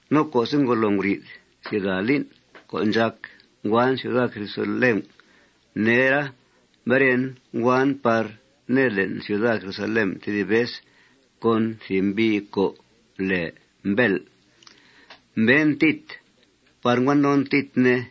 No co'se' ngolo nguri'th sida lín' co' ndxàc nguan ciuda Jerusalén nera, mberen nguan par ned le'n ciuda Jerusalén tedib vez con thìb mbi' co' lèe Mbèl'. Mbeen Tit par ngua non Tit, ne.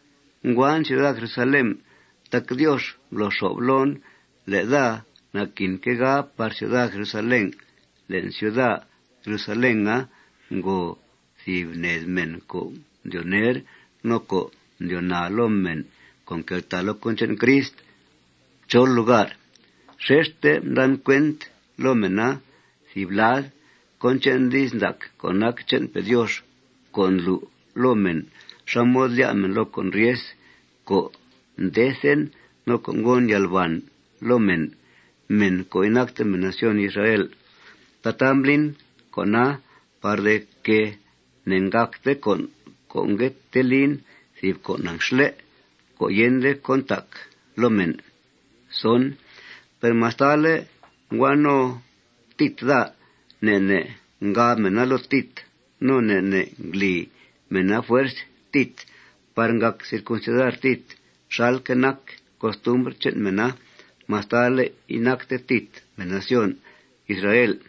Nguan ciuda Jerusalén tac Diox mblo xo'f loon le' daa naquinque' ga par ciuda Jerusalén. Le'n ciuda Jerusalena ngo thìb ned mèn co' mdyoo ner no co' mdyoo naa loo mèn co' nqueltàa loo cón che'n Crist chol lugar. Xexte mdan cuent loo mèna, thìb lad, cón che'n di's ndac co' nac che'npe' Diox co' ndlu' loo mèn xá mod lyá' mèn loo con' ryes, co' ndethen no co' ngon yalbàn loo mèn, mèn co' inacte mèn nación Israel. Tataa mblin con'a par de que ne'gàcte con' co' ngue tee lin thìb con' anxle' co' yende cón ntac loo mèn. Per mastale' ngua no Tit daa, ne' ne' ngab mèna loo Tit no ne' ne' ngli mèna fuerz Tit par ngàc circuncidar Tit xalque' nac costumbr che'n mèna mastale' inacte Tit mèn nación Israel.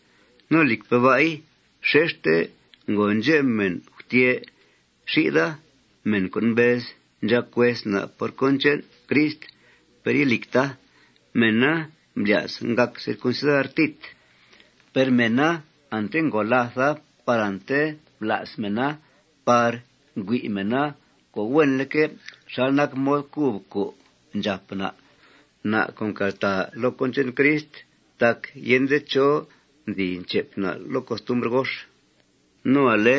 No, lìcpe' ba'i, xexte ngo ndxep mèn gutyè' xi'tha, mèn co' mbez ndxàc hues na' por cón che'n Crist, per ilìcta. Mèna mblya's ngàc circuncidar Tit. Per mèna ante ngo làtha par ante mbla's mèna par ngüi' mèna co' huenleque' xal nac mod cub co' ndxàp na', na' co' nqueltàa loo cón che'n Crist, tac yende chó nzi nchep na' loo costumbr gox. No ale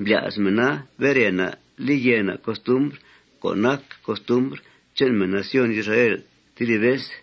mblya's mèna bere na', li yèe na' costumbr co' nac costumbr che'n mèn nación Israel tedib vez.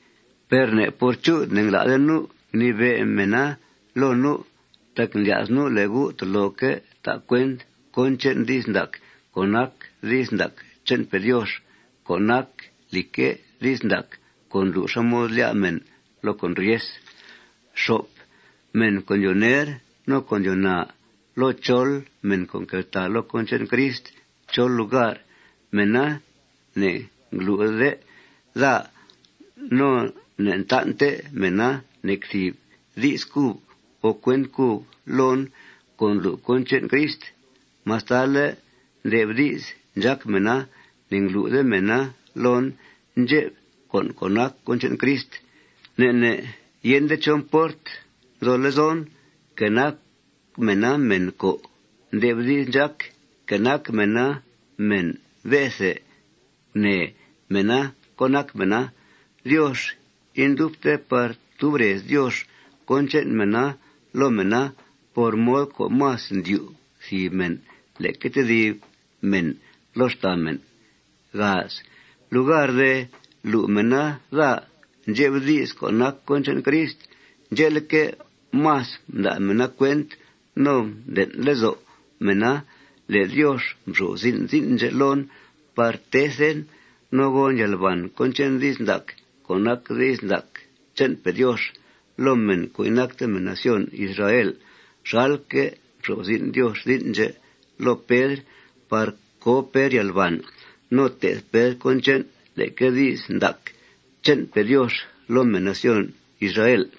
Per ne' por chu'th ne'ngla'de nu' ngnibe' mèna loo nu'. Tac mblya's nu' le' gu' toloque' ta' cuent cón che'n di's ndac co' nac di's ndac che'npe' Diox co' nac lìcque', di's ndac co' ndlu' xá mod lyá' mèn loo con' ryes. Mèn co' ndyoo ner no co' ndyoo naa loo chol mèn co' nqueltàa loo cón che'n Crist chol lugar, mèna ne'nglu'de daa no ne'ntan'te mèna nec thìb di's cub o cuent cub loon co' ndlu' cón che'n Crist. Mastale' nde'f di's ndxác mèna, ne'nglu'de mèna loon ndxep con' co' nac cón che'n Crist. Ne' ne' yende chó mport nzo lezon, que nac mèna mèn co' nde'f di's ndxác, que nac mèna mèn be'the. Gunee mèna cón nac mèna. Diox indubte par tub rez Diox cón che'n mèn loo mèn por mod co' más ndyu' thìb mèn leque tedib mèn loo xtàa mèn. Lugar de lu' mèna daa ndxep di's co' nac cón che'n Crist, ndxe'leque', más mda' mèna cuent no mden' lezo' mèna le' Diox mxo'f zin' zin' ndxè' loon par tethen no gon yalbàn cón che'n di's ndac, co' nac di's ndac che'npe' Diox, loo mèn co' inacte mèn nación Israel xalque' mxo'f zin' Diox zin' ndxè' loo Pedr par co Pedr yalbàn no te'th Pedr cón che'n leque di's ndac che'npe' Diox loo mèn nación Israel.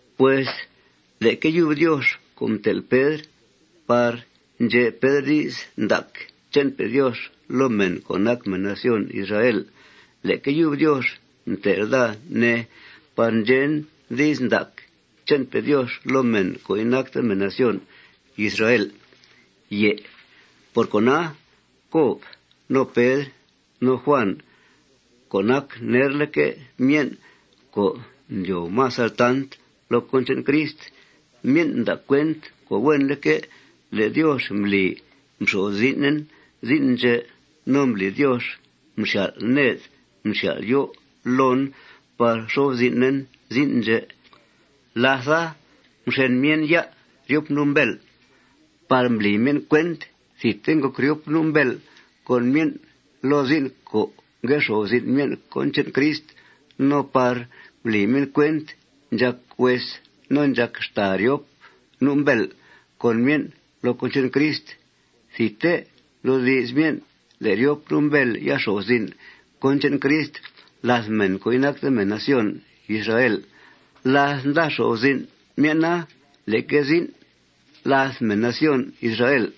Pues leque yub Diox co' mtel' Pedr par ndxe' Pedr di's ndac che'npe' Diox loo mèn co' nac mèn nación Israel, leque yub Diox mtel' daa, ne, par ndxen di's ndac che'npe' Diox loo mèn co' inacte mèn nación Israel. Por cona, Cob no Pedr no Juàn co' nac nerleque' myen' co' ndyoo más altant loo cón che'n Crist, myen' mda' cuent co' huenleque' le' Diox mbli mxo'f zin'en zin' ndxè'. No mbli Diox mxyal' ned mxyal' yó' loon par mxo'f zin'en zin' ndxè'. Látha, mxen myen' ya' ryop nu' Mbèl' par mbli myen' cuent thidte ngòc ryop nu' Mbèl' con myen' loo zin' co' ngue xo'f zin' myen' cón che'n Crist no par mbli myen' cuent ndxàc hues no ndxàc xtàa ryop nu' Mbèl' con myen' loo cón che'n Crist. Thidte mdoodi's myen' le' ryop nu' Mbèl' ya xo'f zin' cón che'n Crist làth mèn co' inacte mèn nación Israel láth nda xo'f zin' myen'a leque zin' làth mèn nación Israel.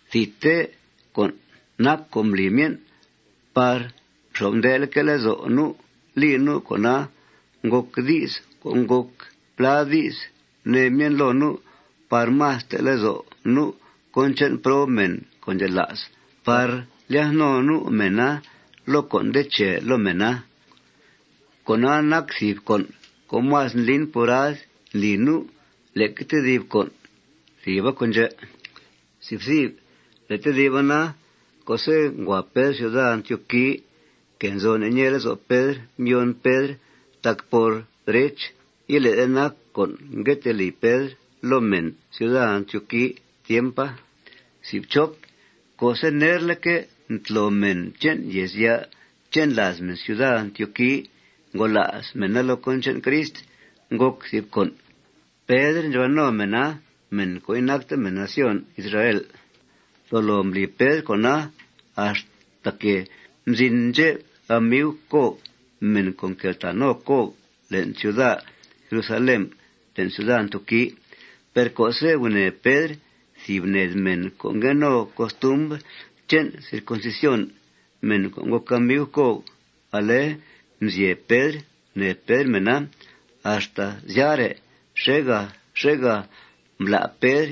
Thidte con' nac co' mbli myen' par xo'f ndeleque' lezo' nu' li nu'. Con'a ngòc di's co' ngòc plá di's gunee myen' loo nu' par más te' lezo' nu' cón che'n prob mèn co' ndxela's par lyath no nu' mèna loo con' nde che loo mèna. Con'a nac thìb con' co' más ndlin purad ndli nu' leque tedib con'. Thìba con' ndxè'. Le' tediba na, co'se' ngua Pedr ciuda Antioqui, que nzo ne' ñee lezo' Pedr mbyoon Pedr, tac, por derech, ilé'de nac con' ngue tee li Pedr loo mèn ciuda Antioqui tiempa. Co'se' nerleque' mtlo mèn che'n yèezya' che'n làaz mèn ciuda Antioqui, ngola's mèna loo cón che'n Crist, ngòc thìb con'. Pedr ndxuhua no mèna, mèn co' inacte mèn nación Israel. Tolo mbli Pedr con'a axtaque' mzin ndxep amiu Cob, mèn co' nqueltàa no Cob le'n ciuda Jerusalén, le'n ciuda Antioqui. Per co'se' gunèe Pedr thìb ned mèn co' ngue no costumbr che'n circuncisión, mèn co' ngòc amiu Cob, ale mzyeb Pedr gunèe Pedr mèna. Axta syare', xèegà xèegà mblá' Pedr.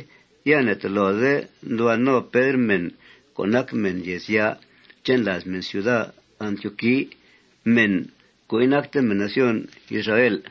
Ya ne'tolode nduhua no Pedr mèn co' nac mèn yèezya' che'n làaz mèn ciuda Antioqui, mèn co' inacte mèn nación Israel.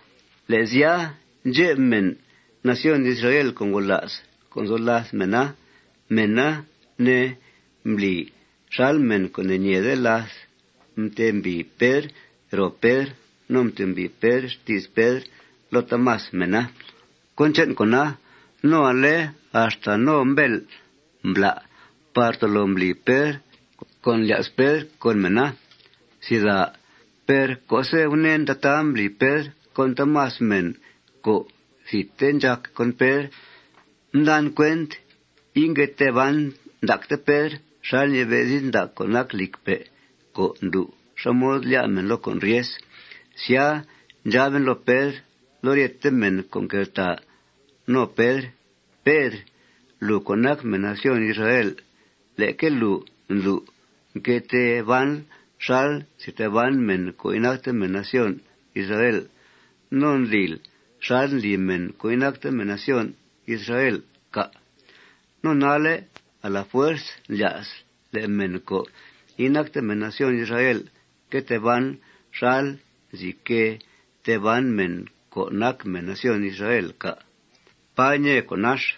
Le' sya, ndxep mèn nación Israel co' ngola's co' nzo làth mèna, mèna, ne, mbli xal mèn co' ne'ñeede láth mtembìi Pedr ro Pedr no mtembìi Pedr xti's Pedr loo taamas mèna cón che'n con'a. No ale axta no Mbèl' mbla' par tolo mbli Pedr cón ndlya's Pedr con mèna. Per co'se' gunèen tataa mbli Pedr con taamas mèn co' thidte ndxàc con Pedr, mdan cuent ingue tee ban ndacte Pedr xal ñibe' di's ndac co' nac lìcpe' co' ndlu' xá mod lyá' mèn loo con' ryes. Sya, ndxaben loo Pedr loo ryete mèn co' nqueltàa no Pedr: Pedr, lùu co' nac mèn nación Israel, leque lùu ndlu' nque tee banl xal nzi tee ban mèn co' inacte mèn nación Israel. No ¿ndlil xal ndli mèn co' inacte mèn nación Israel, cà'? ¿No nalle' a la fuerz ndlya'sl le' mèn co' inacte mèn nación Israel que tee ban xal nzi que tee ban mèn co' nac mèn nación Israel, cà'? ¡Pà ñee conax!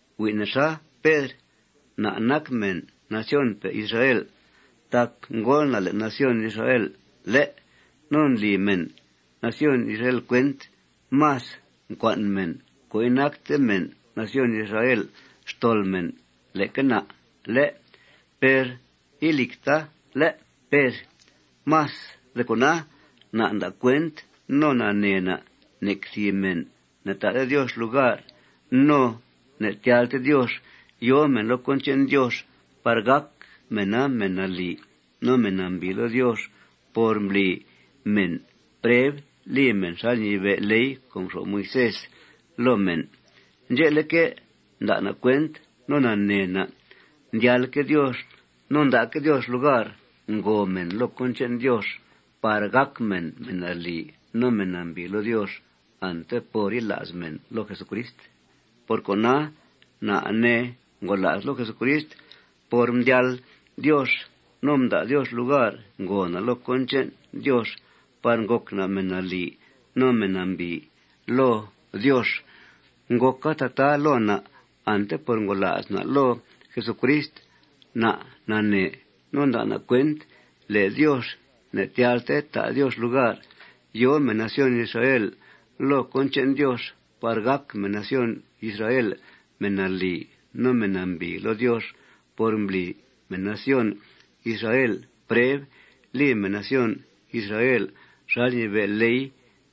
Hui' nexa, Pedr. Na' nac mèn nacionpe' Israel tac ngóol na' le'n nación Israel, ¿lé'? No ndli mèn nación Israel cuent más ncua'n mèn co' inacte mèn nación Israel xtol mèn leque na', ¿lé'? Per ilìcta, ¿lé'?, Pedr. Más de cona, na' nda' cuent no nanee na' nec thìb mèn ne'ta'de Diox lugar no ne'tyalte Diox yòo mèn loo cón che'n Diox par gàc mèna mèn nalì no mèn nambìi loo Diox por mbli mèn preb li mèn xal ñibe' ley co' mxo'f Moisés loo mèn. Ndxe'leque', nda' na' cuent no nanee na' ndyalque' Diox no nda'que' Diox lugar ngòo mèn loo cón che'n Diox par gàc mèn mèn nalì no mèn nambìi loo Diox ante por yila's mèn loo Jesucrist. Por cona, na', ne, ngola's loo Jesucrist por mdyal Diox no mda' Diox lugar ngòo na' loo cón che'n Diox par ngòc na' mèn nalì no mèn nambìi loo Diox. Ngòca tataa loo na' ante por ngola's na' loo Jesucrist. Na' nanee no nda' na' cuent le' Diox ne'tyalte ta' Diox lugar yòo mèn nación Israel loo cón che'n Diox par gàc mèn nación Israel mèn nalì no mèn nambìi loo Diox por mbli mèn nación Israel preb li mèn nación Israel xal ñibe' ley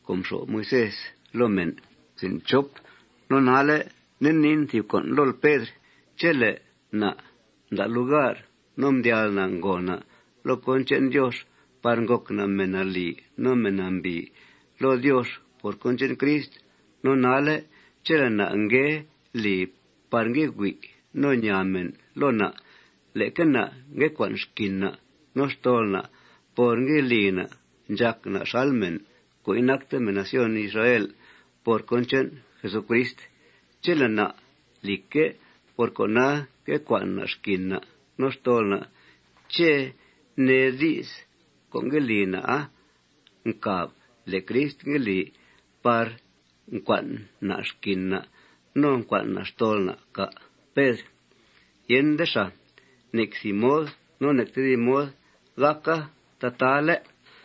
co' mxo'f Moisés loo mèn. No nalle', nde niin thìb con' lool, Pedr: Chele' na' mda' lugar no mdyal na' ngòo na' loo cón che'n Diox par ngòc na' mèn nalì no mèn nambìi loo Diox por cón che'n Crist, no nalle' chele' na' ngue li par ngue hui' no ñaa mèn loo na', leque na' ngue cua'n xquin na' no xtol na' por ngue li na' ndxàc na' xal mèn co' inacte mèn nación Israel por cón che'n Jesucrist. Chele' na', lìcque', por cona ngue cua'n na' xquin na' no xtol na', ¿ché' nee di's co' ngue li na'a ncàb le' Crist ngue li par ncua'n na' xquin na' no ncua'n na' xtol na', cà', Pedr? Yende xàa. Nec thìb mod no nec tedib mod gàca tataa, ¿lé'?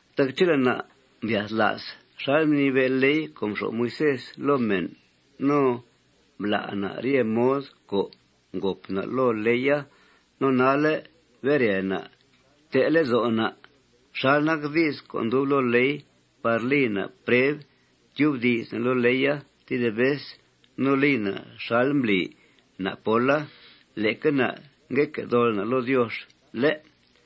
Tac chele' na' mbyathla's xal mnibe' ley co' mxo'f Moisés loo mèn no mblá' na' rye mod co' ngòp na' loo leya, no nalle' bere na', te' lezo' na' xal nac di's co' ndub loo ley par li na' preb tyubdi's na' loo leya tedib vez no li na' xal mbli na' póla, leque na' nque dol na' loo Diox, ¿lé'?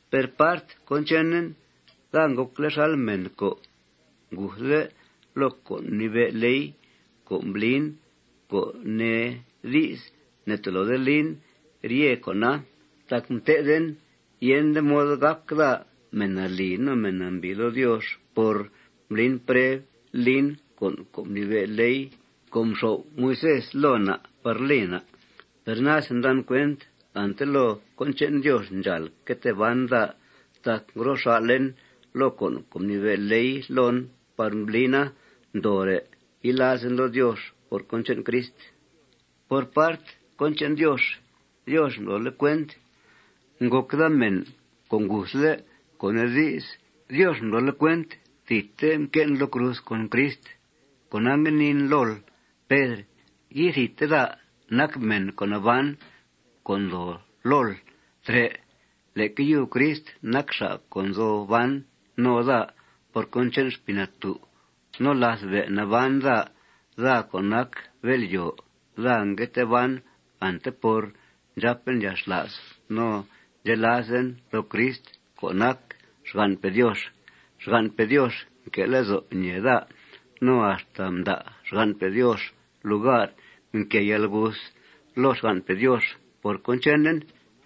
Per part cón chenen, daa ngòcle' xal mèn co' nguthle' loo con' co' mnibe' loo ley co' mblin, co' nee di's, ne'toloden lin rye con'a, tac mté'then yende mod gàc daa mèn nalì no mèn nambìi loo Diox por mblin preb lin con' co' mnibe' ley co' mxo'f Moisés loo na' par li na'. Per nase ndan cuent ante loo cón che'n Diox ndxàal que tee ban daa tac ngro xà'len loo con' co' mnibe' leya loon par mblina ndoore' yilazen loo Diox por cón che'n Crist. Por part cón che'n Diox, Diox mblole' cuent ngòc daa mèn co' nguthle', co' nee di's, Diox mblole' cuent thidte mque'en loo cruz con Crist. Cona, ngue niin lool, Pedr: Ithidte daa nac mèn co' naban co' ndoo lool trè'. Leque yub Crist nac xa' co' nzo ban no daa por cón che'n Xpii Natú'. No láth be' naban daa, daa co' nac bél'yòo, daa ngue tee ban ante por ndxàpen yalxla's no ndxelazen loo Crist co' nac xgan'pe' Diox. Xgan'pe' Diox nque' lezo' ñèe daa. No axta mda' xgan'pe' Diox lugar mquée yalguth loo xgan'pe' Diox por cón chenen.